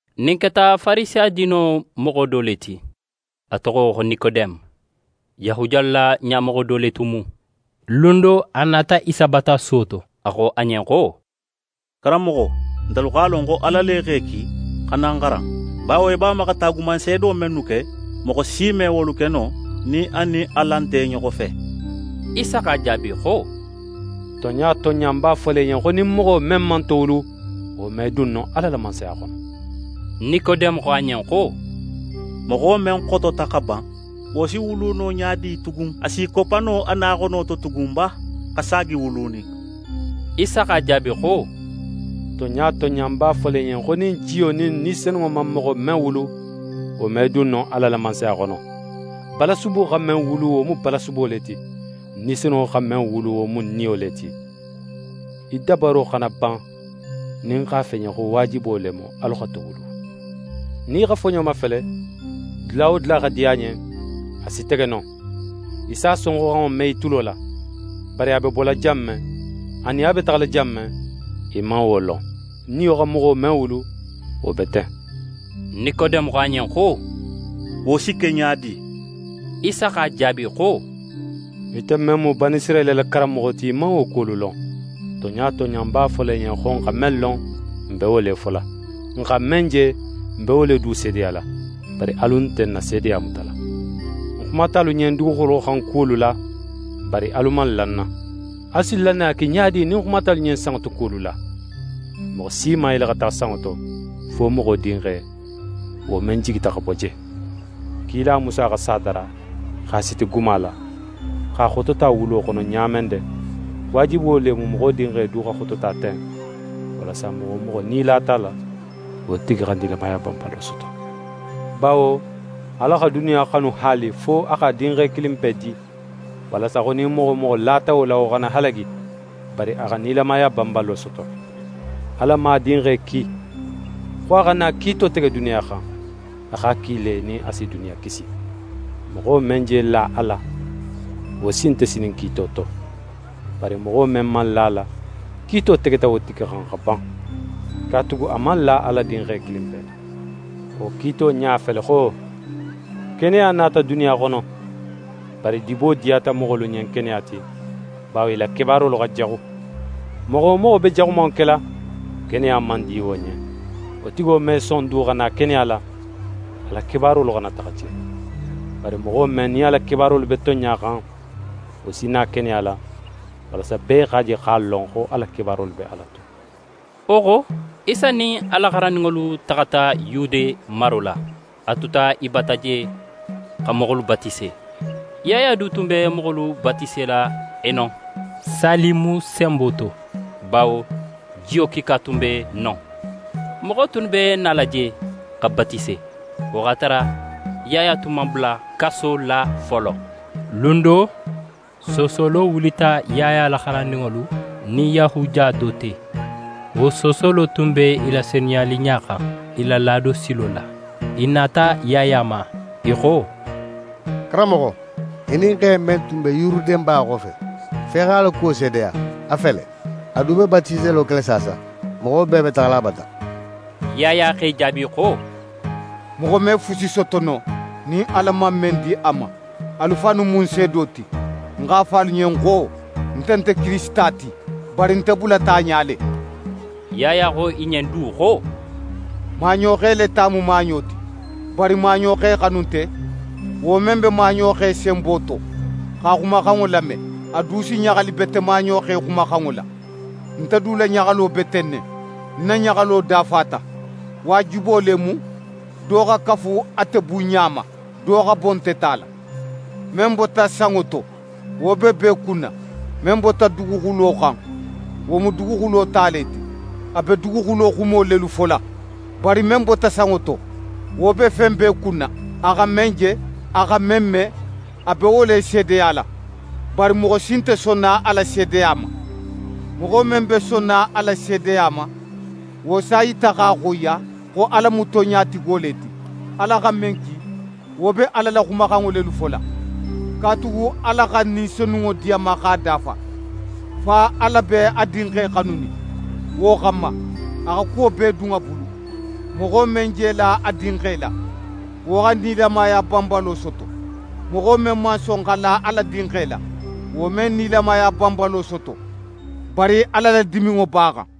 Ɲin keta Farisiya diino moxo do le ti, a toxo xo Nikodeme. Yahudiyalu la ɲamoxo do le tun mu. Lun do, a nata Isa bata suwo to, a xo a ɲen xo: «Karanmoxo, ntelu x'a lon xo Ala le x'é ki xa na n xaran. Bawo í b'a ma xa taagumanseedo mennu ke, moxo si me wolu ke no nin a nin Ala nte i ɲoxo fe.» Isa x'a jaabi xo: «Tonɲa tonɲa, ń b'a fola í ɲen, xo nin moxo men man towulu, wo me dun no Ala la Mansaya xono.» Nikodeme xo a ɲen xo: «Moxo men xotota xa ban, wo si wulu no ɲa di tugun? A s'í koppa no a na xono to tugun ba, xa saagi wulunin?» Isa x'a jaabi xo: «Tonɲa tonɲa, ń b'a fola í ɲen, xo nin jiyo nin Ni Senunŋo man moxo men wulu, wo me dun no Ala la Mansaya xono. Balasubo xa men wulu, wo mu balasubo le ti. Ni Senunŋo xa men wulu, wo mu niyo le ti. Í dabaro xana ban nin ń x'a fo í ɲen xo waajibo le mu, alu xa towulu. Nin í xa foɲo mafele, dula wo dula xa di a ɲen, a si tege non. Í s'a sonxoxanŋo me í tulo la, bari a be bola jan men anin a be taxala jan men, í man wo lon. Niyo xa moxo men wulu, wo be ten.» Nikodeme xo a ɲen xo: «Wo si ke ɲa di?» Isa x'a jaabi xo: «Ite men mu Banisirayila la karanmoxo ti, í man wo kuwolu lon? Tonɲa tonɲa, ń b'a fola í ɲen xo, n xa men lon, n be wo le fola. N xa men je, n be wo le du seedeyala. Bari alu nte n na seedeya mutala. Ń xumata alu ɲen duguxulo xan kuwolu la, bari alu man la ń na. Alu si lannaya ke ɲa di nin ń xumata alu ɲen sanŋo to kuwolu la? Moxo si man yele xa taxa sanŋo to, fo Moxo Dinxe, wo men jigita xa bo je. «Kila Musa xa sa dara, x'a siti guma la, x'a xotota wulo xono ɲa men de, waajibo le mu Moxo Dinxe du xa xotota ten, walasa moxo wo moxo nin í lata a la, wo tigi xa nilamaya banbalo soto. Bawo Ala xa duniya xanu haali fo a x'a Dinxe kilinpe di, walasa xo nin moxo wo moxo lata wo la, wo xana halagi, bari a xa nilamaya banbalo soto. Ala man a Dinxe ki xo a xa na kiito tege duniya xan. A x'a ki le, nin a si duniya kisi. «Moxo men je la a la, wo sin nte sinin kiito to; bari moxo men man la a la, kiito tegeta wo tigi xan xa ban, katugu a man la Ala Dinxe kilinpe la. Wo kiito ɲa fele xo: Keneya nata duniya xono, bari dibo diyata moxolu ɲen keneya ti, bawo i la kebaarolu xa jaxu. Moxo wo moxo be jaxumanŋo kela, keneya man di wo ɲen. Wo tigo me son du xa na keneya la, a la kebaarolu xana taxa je. Bari moxo men, nin a la kebaarolu be tonɲa xan, wo si na keneya la, walasa bee x'a je x'a lon xo a la kebaarolu be Ala to.» Wo xo, Isa nin a la xarandinŋolu taxata Yude maro la. A tuta i bata je xa moxolu batise. Yaya du tun be moxolu batisela Enon, Salimu senbo to, bawo jiyo kiika tun be non. Moxo tunnu be nala je xa batise. Wo x'a tara Yaya tun man bula kaso la folo. Lun do, soosolo wulita Yaya la xarandinŋolu nin Yahudiya do te. Wo soosolo tun be i la senuyaliɲa xan, i la laado silo la. I nata Yaya ma, i xo: «Karanmoxo, í nin xe men tun be Yuruden ba xofe, fo í x'a la kuwo seedeya, a fele: A du be batiselo kela saasa. Moxo bee be taxala a bata.» Yaya x'e jaabi xo: «Moxo me fusi soto no nin Ala man men di a ma. Alu fannu mu ń seedo ti, ń x'a fo alu ɲen xo: Nte nte Kirisita ti, bari nte bulata a ɲa le.» Yaya xo i ɲen du xo: «Maaɲoxe le ta mu maaɲo ti. Bari maaɲoxe xanunte, wo men be maaɲoxe senbo to, x'a xumaxanŋo lame, a du si ɲaxali bete maaɲoxe xumaxanŋo la. Nte du la ɲaxalo be ten ne. Ń na ɲaxalo dafata. Waajibo le mu, do xa kafu ate bunɲa ma, do xa bo nte ta la. «Men bota sanŋo to, wo be bee kunna; men bota duguxulo xan, wo mu duguxulo ta le ti, a be duguxulo xumo lelu fola. Bari men bota sanŋo to, wo be fen bee kunna; a xa men je, a xa men me, a be wo le seedeyala. Bari moxo si nte sonna a la seedeya ma. Moxo men be sonna a la seedeya ma, wo s'a yita x'a xoyiya, xo Ala mu tonɲatigo le ti. Ala xa men ki, wo be Ala la xumaxanŋo lelu fola, katugu Ala xa Ni Senunŋo di a ma x'a dafa. Fa Ala be a Dinxe xanunin. Wo xanma, a xa kuwo bee dun a bulu. Moxo men je la a Dinxe la, wo xa nilamaya banbalo soto; moxo men man son xa la Ala Dinxe la, wo me nilamaya banbalo soto, bari Ala la diminŋo b'a xan.»